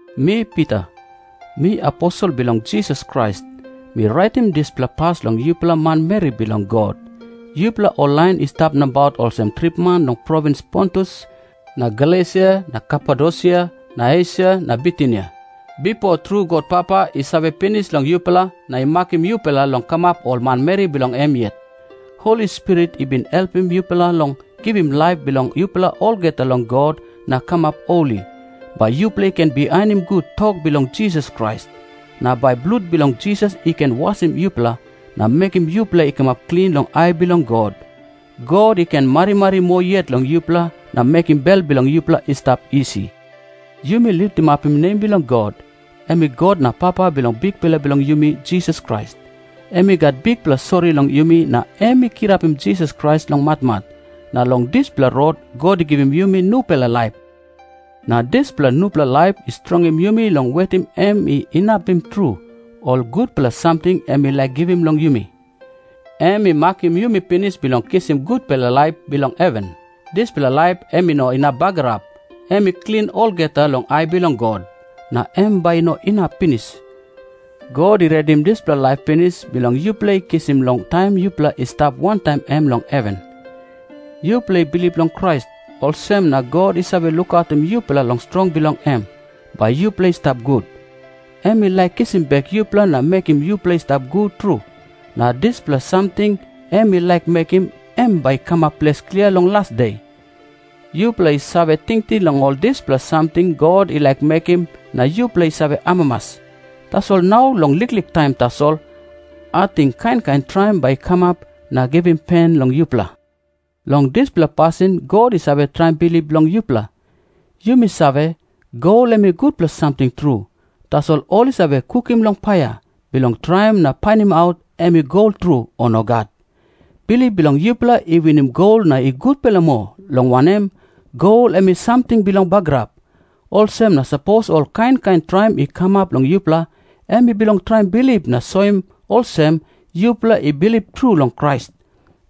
Mi Pita, mi aposel bilong Jisas Krais. Mi raitim dispela pas long yupela manmeri bilong God, yupela ol lain i stap nabaut olsem tripman long provins Pontus na Galesia na Kapadosia na Esia na Bitinia. Bipo tru God Papa i save pinis long yupela na i makim yupela long kamap ol manmeri bilong em yet. Holi Spirit i bin helpim yupela long givim laip bilong yupela olgeta long God na kamap holi, bai yupela i ken bihainim gut tok bilong Jisas Krais. Na bai blut bilong Jisas i ken wasim yupela, na mekim yupela i kamap klin long ai bilong God. God i ken marimari moa yet long yupela na mekim bel bilong yupela i stap isi. Yumi litimapim nem bilong God, em i God na Papa bilong Bikpela bilong yumi, Jisas Krais. Em i gat bikpela sori long yumi, na em i kirapim Jisas Krais long matmat, na long dispela rot God i givim yumi nupela laip. Na dispela nupela laip i strongim yumi long wetim em i inapim tru ol gutpela samting em i laik givim long yumi. Em i makim yumi pinis bilong kisim gutpela laip bilong heven. Dispela laip em i no inap bagarap. Em i klin olgeta long ai bilong God, na em bai i no inap pinis. God i redim dispela laip pinis, bilong yupela i kisim long taim yupela i stap wantaim em long heven. Yupela i bilip long Krais, olsem na God i save lukautim yupela long strong bilong em, bai yupela i stap gut. Em i laik kisim bek yupela na mekim yupela i stap gut tru, na dispela samting em i laik mekim, em bai i kamap ples klia long las de. Yupela i save tingting long ol dispela samting God i laik mekim na yupela i save amamas. Tasol nau long liklik taim tasol, ating kain kain traim bai i kamap na givim pen long yupela. Long dispela pasin God i save traim bilip bilong yupela. Yumi save, gol em i gutpela samting tru, tasol ol i save kukim long paia, bilong traim na painimaut em i gol tru, o nogat. Bilip bilong yupela i winim gol na i gutpela moa, long wanem, gol em i samting bilong bagarap. Olsem na sapos ol kain kain traim i kamap long yupela, em i bilong traim bilip na soim olsem, yupela i bilip tru long Krais.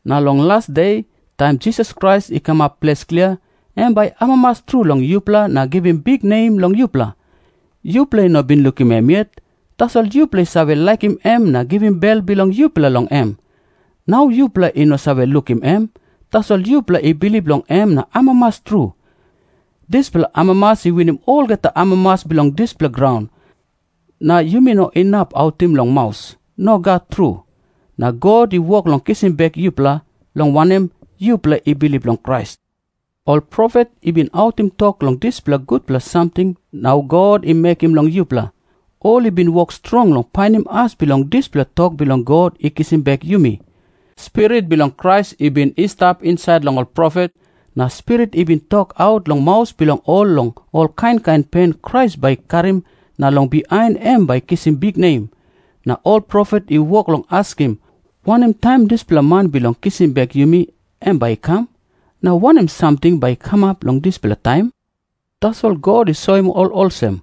Na long las de, taim Jisas Krais i kamap ples klia, em bai i amamas tru long yupela na givim biknem long yupela. Yupela i no bin lukim em yet, tasol yupela i save laikim em na givim bel bilong yupela long em. Nau yupela i no save lukim em, tasol yupela i bilip long em na amamas tru. Dispela amamas i winim olgeta amamas bilong dispela graun, na yumi no inap autim long maus. Nogat tru. Na God i wok long kisim bek yupela, long wanem, yupela i bilip long Krais. Ol profet i bin autim tok long dispela gutpela samting nau God i mekim long yupela. Ol i bin wok strong long painim as bilong dispela tok bilong God i kisim bek yumi. Spirit bilong Krais i bin i stap insait long ol profet, na Spirit i bin tokaut long maus bilong ol long ol kain kain pen Krais bai i karim na long bihain em bai i kisim biknem. Na ol profet i wok long askim, “Wanem taim dispela man bilong kisim bek yumi, em bai i kam?” na “Wanem samting bai i kamap long dispela taim?” Tasol God i soim ol olsem,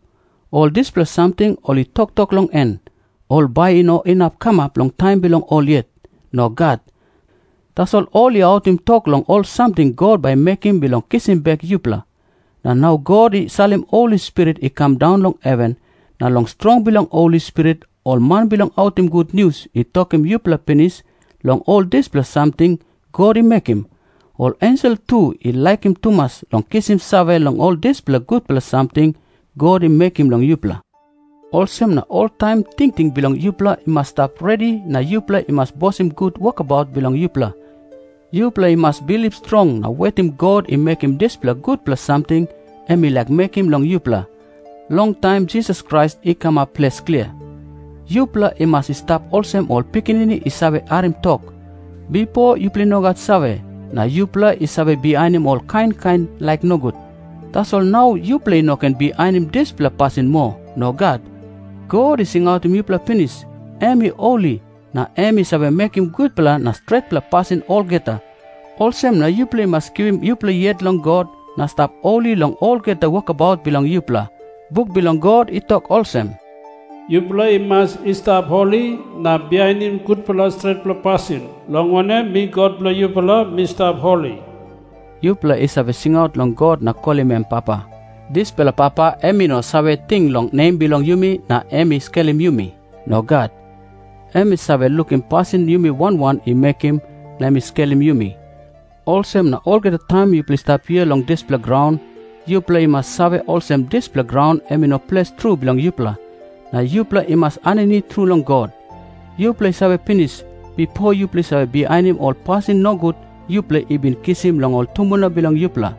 ol dispela samting ol i toktok long en, ol bai i no inap kamap long taim bilong ol yet. Nogat. Tasol ol i autim tok long ol samting God bai i mekim bilong kisim bek yupela. Na nau God i salim Holi Spirit i kam daun long heven, na long strong bilong Holi Spirit, ol man bilong autim gutnius i tokim yupela pinis long ol dispela samting God i mekim. Ol ensel tu i laikim tumas long kisim save long ol dispela gutpela samting God i mekim long yupela. Olsem na oltaim tingting bilong yupela i mas i stap redi na yupela i mas bosim gut wokabaut bilong yupela. Yupela i mas bilip strong na wetim God i mekim dispela gutpela samting em i laik mekim long yupela, long taim Jisas Krais i kamap ples klia. Yupela i mas i stap olsem ol pikinini i save harim tok. Bipo yupela i no gat save, na yupela i save bihainim ol kain kain laik nogut. Tasol nau yupela i no ken bihainim dispela pasin moa. Nogat. God i singautim yupela pinis, em i holi na em i save mekim gutpela na stretpela pasin olgeta. Olsem na yupela i mas givim yupela yet long God na stap holi long olgeta wokabaut bilong yupela. Buk bilong God i tok olsem, “Yupela i mas i stap holi na bihainim gutpela stretpela pasin, long wanem, mi God bilong yupela, mi stap holi.” Yupela i save singaut long God na kolim em “Papa.” Dispela Papa em i no save ting long nem bilong yumi na em i skelim yumi. Nogat. Em i save lukim pasin yumi wan wan i mekim na em i skelim yumi. Olsem na olgeta taim yupela i stap hia long dispela graun, yupela i mas save olsem dispela graun em i no ples tru bilong yupela, na yupela i mas aninit tru long God. Yupela i save pinis, bipo yupela i save bihainim ol pasin nogut yupela i bin kisim long ol tumbuna bilong yupela.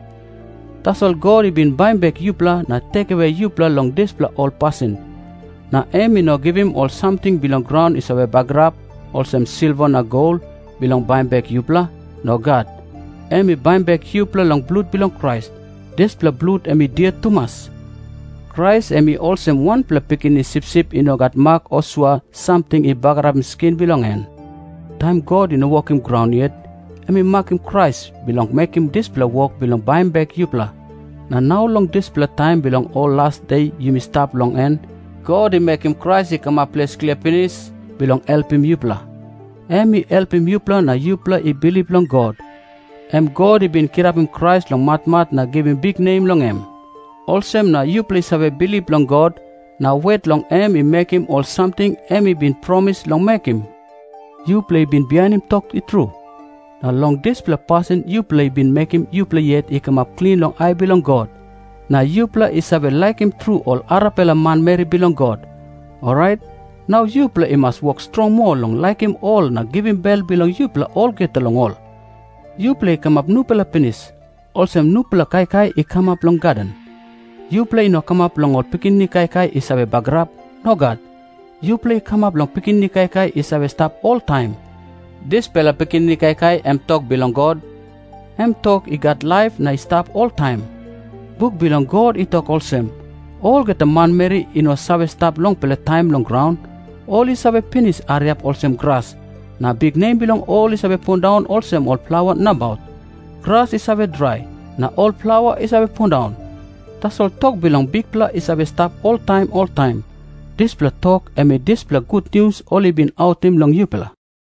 Tasol God i bin baim bek yupela na helpim yupela long lusim ol dispela pasin. Na em i no givim ol samting bilong graun i save bagarap, olsem silva na gol, bilong baim bek yupela. Nogat. Em i baim bek yupela long blut bilong Krais. Dispela blut em i dia tumas. Krais em i olsem wanpela pikinini sipsip i no gat mak o sua samting i bagarapim skin bilong en. Taim God i no wokim graun yet, em i makim Krais bilong mekim dispela wok bilong baim bek yupela. Na nau long dispela taim bilong ol las de yumi stap long en, God i mekim Krais i kamap ples klia pinis, bilong helpim yupela. Em i helpim yupela na yupela i bilip long God, em God i bin kirapim Krais long matmat na givim biknem long em. Olsem na yupela i save bilip long God, na wet long em i mekim ol samting em i bin promis long mekim. Yupela i bin bihainim tok i tru, na long dispela pasin yupela i bin mekim yupela yet i kamap klin long ai bilong God. Na yupela i save laikim tru ol arapela manmeri bilong God. Orait nau yupela i mas wok strong moa long laikim ol na givim bel bilong yupela olgeta long ol. Yupela i kamap nupela pinis, olsem nupela kaikai i kamap long gaden. Yupela i no kamap long ol pikinini kaikai i save bagarap. Nogat. Yupela i kamap long pikinini kaikai i save stap oltaim. Dispela pikinini kaikai em tok bilong God, em tok i gat laip na i save stap oltaim. Buk bilong God i tok olsem, “Olgeta manmeri i no save stap longpela taim long graun. Ol i save pinis hariap olsem gras, na biknem bilong ol i save pundaun olsem ol plaua nabaut. Gras i save drai, na ol plaua i save pundaun. Tasol tok bilong Bikpela i save stap oltaim oltaim.” Dispela tok em i dispela gutnius ol i bin autim long yupela.